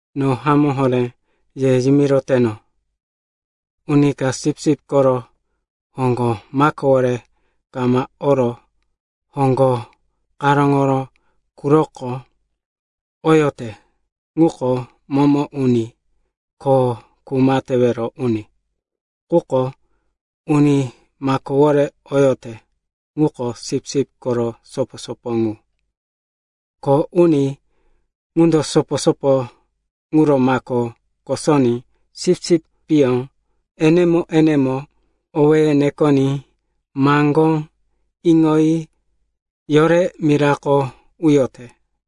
“No hamó horé ye yimiroteno, uni ka sipsip koro hoŋgo makowore kama oro hoŋgo karóŋoro quroko oyote, ŋuko momo uni ko kuma tewero uni. Quko uni makowore oyote ŋuko sipsip koro sopo-sopo ŋu. Kho uni ŋundo sopo-sopo ŋuro mako kosoní sipsipyó enemo-enemo owéye nekoní maŋgó iŋoyi yore mirako uyote.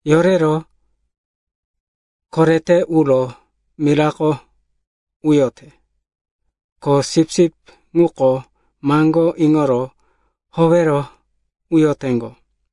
Yorero korete uro mirako uyote. Ko sipsip ŋuko maŋgó iŋoro howero uyoteŋgo.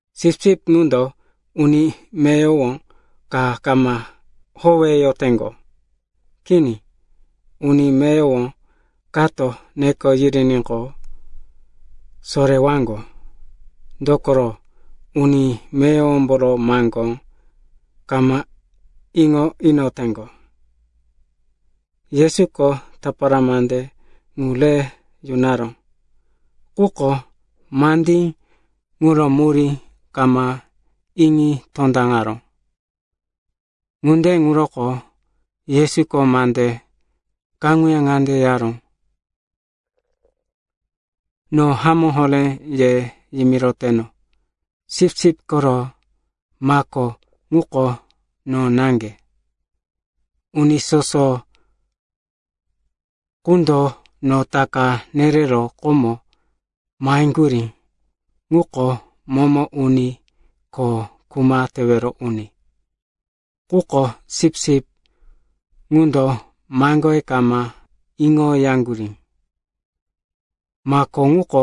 Sipsip ŋundo uni meyowo ka kama howeyoteŋgo. Kini. Uni meyowo kato neko yiriníqo, sorewaŋgo, dokoro, uni meyowomboro maŋgó kama iŋo inoteŋgo.” Yesuko tapara mande ŋu re yunaró, quko mandí ŋuro murí kama iŋi tondaŋaró. Ŋunde ŋuroko Yesuko mande kaŋuya ŋande yaró, “No hamó horé ye yimiroteno, sipsip koro mako ŋuko no naŋge. Uni soso qundo no taka nerero komo maheŋgurí ŋuko momo uni ko kuma tewero uni. Quko sipsip ŋundo maŋgoye kama iŋoyaŋgurí. Mako ŋuko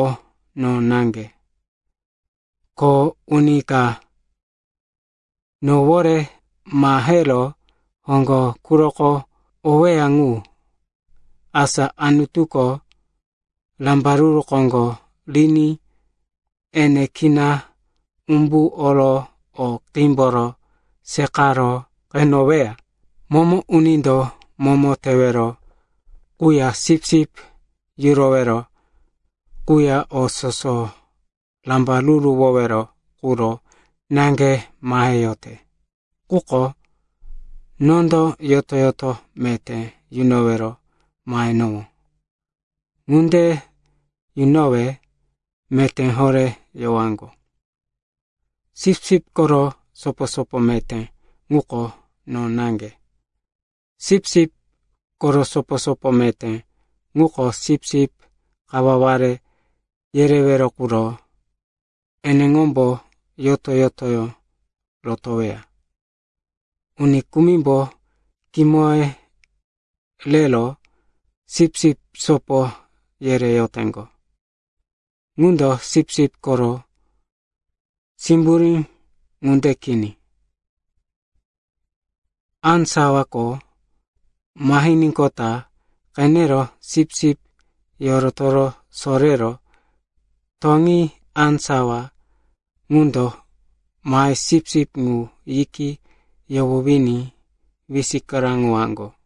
no naŋge. Ko uni ka nowore mahero hoŋgo quroko oweya ŋu, asa Anutuko rambaruru koŋgo riní ene kina umbu oro o qímboro seqaro qeneweya. Momo unindo momo tewero quya sipsip yurowero quya o soso rambaruruwowero quro naŋge maheyote. Quko nondo yoto-yoto meté yunowero mahenowó. Ŋunde yunowe meté horé yowaŋgo. “Sipsip koro sopo-sopo meté ŋuko no naŋge. Sipsip koro sopo-sopo meté ŋuko sipsip kawaware yerewero quro eneŋombo yoto-yotoyó rotoweya. Uni kumimbo kimoye rero sipsip sopo yereyoteŋgo. Ŋundo sipsip koro simburí ŋunde kini. Á sawako mahiníqota qenero sipsip yorotoro sorero toŋi á sawa ŋundo mahero sipsip ŋu yiki yohowiní wisikaraŋowaŋgo.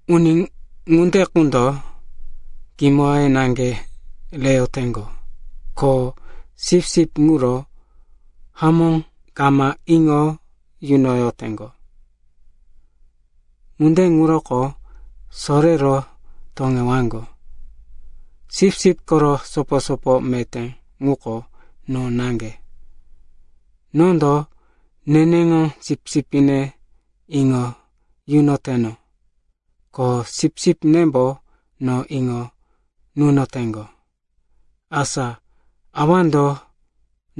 Uni ŋunde qundo kimoye naŋge reyoteŋgo ko sipsip ŋuro hamó kama iŋo yunoyoteŋgo. Ŋunde ŋuroko sorero toŋewaŋgo. “Sipsip koro sopo-sopo meté ŋuko no naŋge. Nondo neneŋo sipsipne iŋo yunoteno, ko sipsipnembo no iŋo nunoteŋgo, asa Awando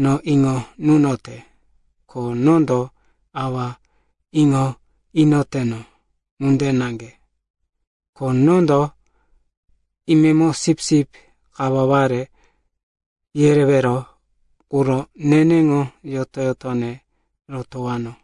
no iŋo nunote ko nondo Awa iŋo inoteno ŋunde naŋge. Ko nondo imemo sipsip kawaware yerewero quro neneŋo yoto-yotone rotowano.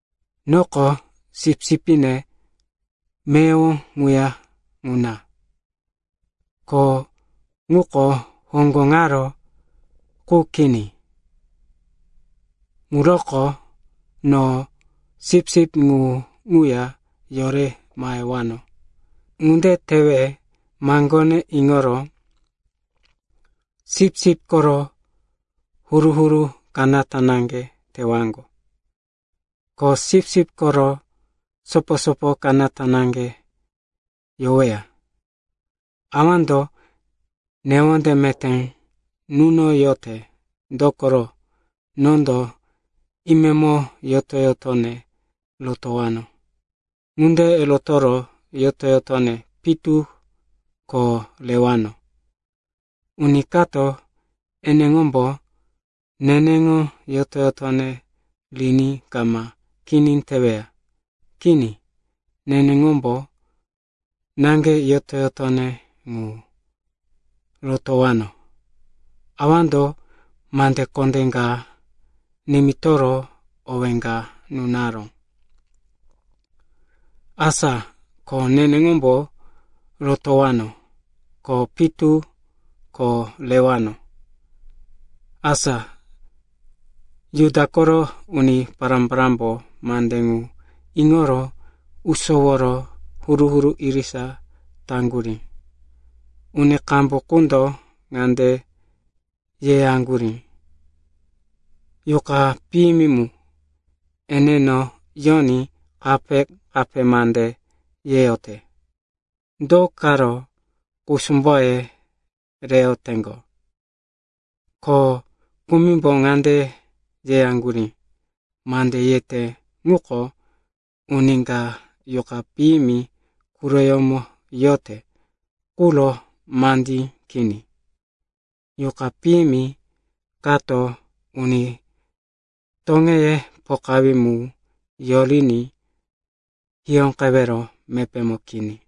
Noko sipsipne meyowo ŋuya ŋuna, ko ŋuko hoŋgo ŋaro qu kini. Ŋuroko no sipsip ŋu ŋuya yore mahewano. Ŋunde tewe maŋgone iŋoro sipsip koro huru-huru kanata naŋge tewaŋgo, ko sipsip koro sopo-sopo kanata naŋge yoweya. Awando newonde meté nunoyote, dokoro, nondo imemo yoto-yotone rotowano. Ŋunde rotoro yoto-yotone pitu ko rewano. Uni kato eneŋombo neneŋo yoto-yotone riní kama kini teweya. Kini. Neneŋombo naŋge yoto-yotone ŋu rotowano. Awando mande kondé ka nimitoro owé ka nunaró. Asa ko neneŋombo rotowano, ko pitu ko rewano.” Asa Juda koro uni pará-parámbo mande ŋu iŋoro usoworo huru-huru irisa taŋgurí. Uni qambu qundo ŋande yeyaŋgurí, “Yuqa piyimi mu eneno yoní kape-kape mande yeyote. Do karo kusumboye reyoteŋgo?” Ko kumimbo ŋande yeyaŋgurí, “Mande yete ŋuko uni ka yuqa piyimi quroyómo yote quro mandí kini. Yuqa piyimi kato uni toŋeye pokawí mu yoriní hiyóqewero mepémo kini.”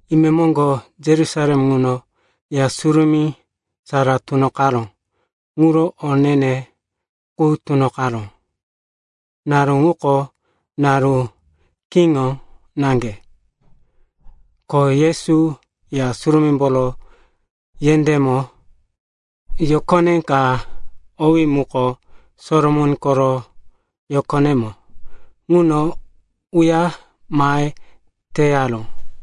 Imemoŋgo Yerusalem ŋuno Ya Surumí Sara Tunoqaró ŋuro o ne-ne ŋu tunoqaró. Naru ŋuko naru kiŋo naŋge, ko Yesu Ya Surumímboro yendémo, yokone ka owí muko Solomon koro Yokonemo ŋuno uya mahe teyaró.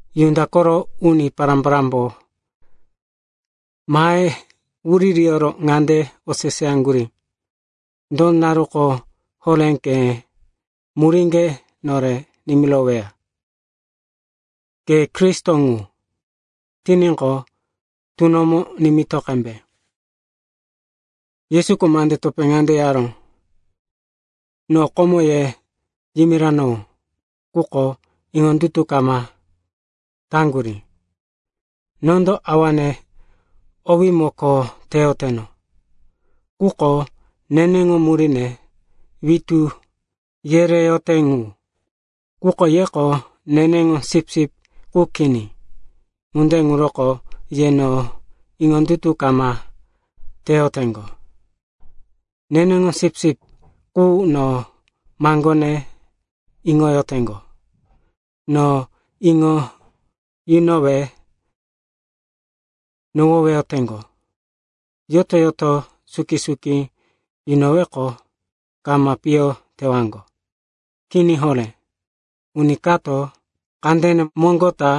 Juda koro uni pará-parámbo mahe wuririyoro ŋande oseseyaŋgurí, “Do naruko horé ke muríŋge nore nimiroweya? Ke Kristo ŋu tiníqo, tunomo nimito qembe.” Yesuko mande topé ŋande yaró, “No komo ye yimiranowó, quko iŋondutu kama taŋgurí. Nondo Awane owímo kho teyoteno ŋuko neneŋo muríne witú yereyote ŋu. Quko yeko neneŋo sipsip qu kini. Ŋunde ŋuroko ye no iŋondutu kama teyoteŋgo. Neneŋo sipsip qu no maŋgone iŋoyoteŋgo. No iŋo yunowe nohoweyoteŋgo. Yoto-yoto suki-suki yunoweqo kama piyo tewaŋgo. Kini horé. Uni kato kandene moŋgo ta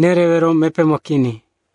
nerewero mepémo kini.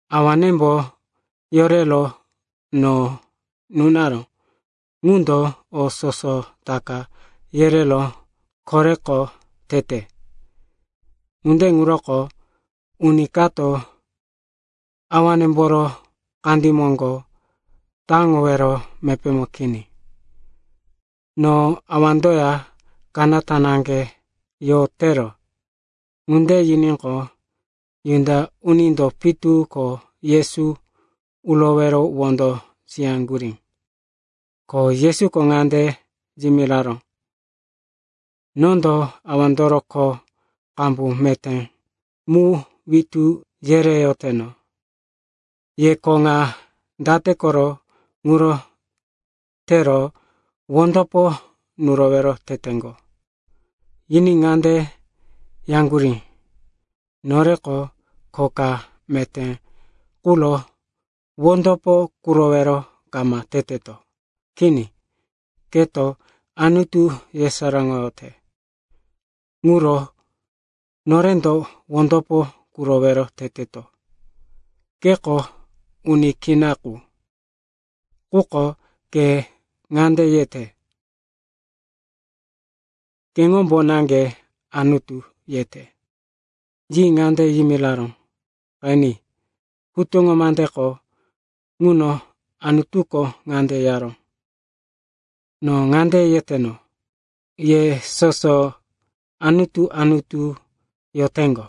Awanembo yorero no nunaró ŋundo o soso taka yerero koreko tete. Ŋunde ŋuroko uni kato Awanemboro kandí moŋgo taŋowero mepémo kini. No Awandoya kanata naŋge yotero.” Ŋunde yiníqo, Juda unindo pitu ko Yesu urowero wondo siyaŋgurí. Ko Yesuko ŋande yimiraró, “Nondo Awandoro kho qambu meté mu witú yereyoteno. Ye kho ŋa date koro ŋuro tero wondopo nurowero teteŋgo?” Yiní ŋande yaŋgurí, “Noreko kho ka meté quro wondopo kurowero kama teteto. Kini, keto Anutu yesaráŋoyote ŋuro norendo wondopo kurowero teteto. Keko uni kina qu, quko ke ŋande yete, keŋombo naŋge Anutu, yete.” Yi ŋande yimiraró, “Qeni, hutuŋo mandeko ŋuno Anutuko ŋande yaró, ‘No ŋande yeteno, “Ye soso anutu-anutu yoteŋgo,”’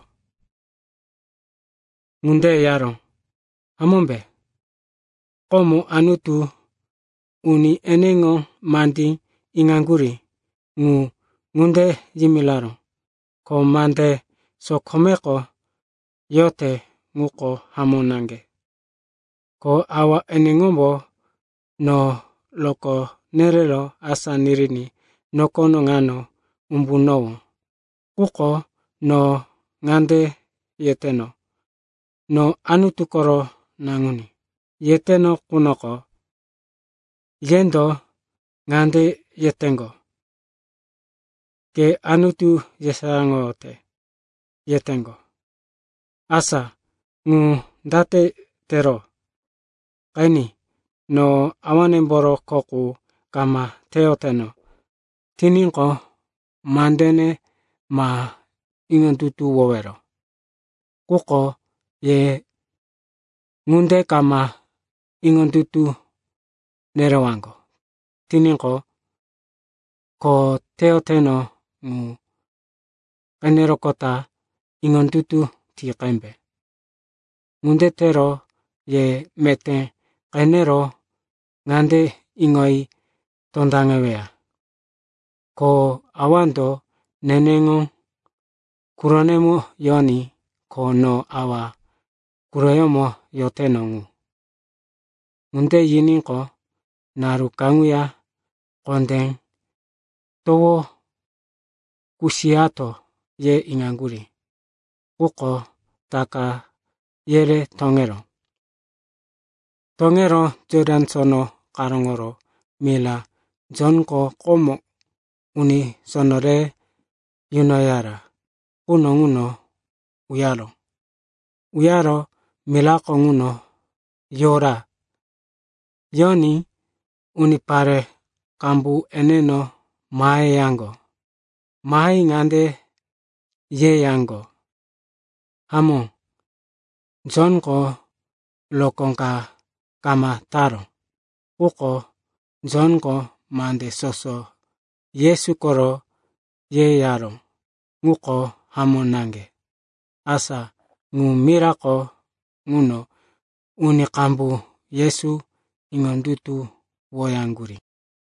ŋunde yaró, hamómbe? Komo Anutuko uni eneŋo mandí iŋaŋgurí ŋu ŋunde yimiraró, ko mande sokomeko yote ŋuko hamó naŋge. Ko Awa eneŋombo no rokó nerero asá niriní nokono ŋano umbunowó. Quko no ŋande yeteno, ‘No Anutu koro Naŋuní,’ yeteno qunoko, yendo ŋande yeteŋgo, ‘Ke Anutu yesaráŋoyote,’ yeyoteŋgo. Asa ŋu date tero? Qeni, no Awanemboro kho qu kama teyoteno tiníqo, mandene ma iŋondutuwowero. Quko ye ŋunde kama iŋondutu nerewaŋgo tiníqo, kho teyoteno ŋu qeneroqota iŋondutu ti qembe. Ŋunde tero ye meté qenero ŋande iŋoyi tondaŋeweya, ko Awando neneŋo quronemo yoní, ko no Awa quroyómo yoteno ŋu.” Ŋunde yiníqo, naru kaŋuya kondé towo kusiyato, ye iŋaŋgurí, quko taka yere toŋeró. Toŋero Jotan Sono karóŋoro mira Jonko komo uni sono re yunoyara quno ŋuno uyaró. Uyaro mirako ŋuno yora. Yoní unipare qambu eneno maheyaŋgo. Mahe ŋande yeyaŋgo, “Hamó, Jonko rokó ka kama taró. Quko Jonko mande soso Yesu koro yeyaró ŋuko hamó naŋge.” Asa ŋu mirako ŋuno uni qambu Yesu iŋondutuwoyaŋgurí.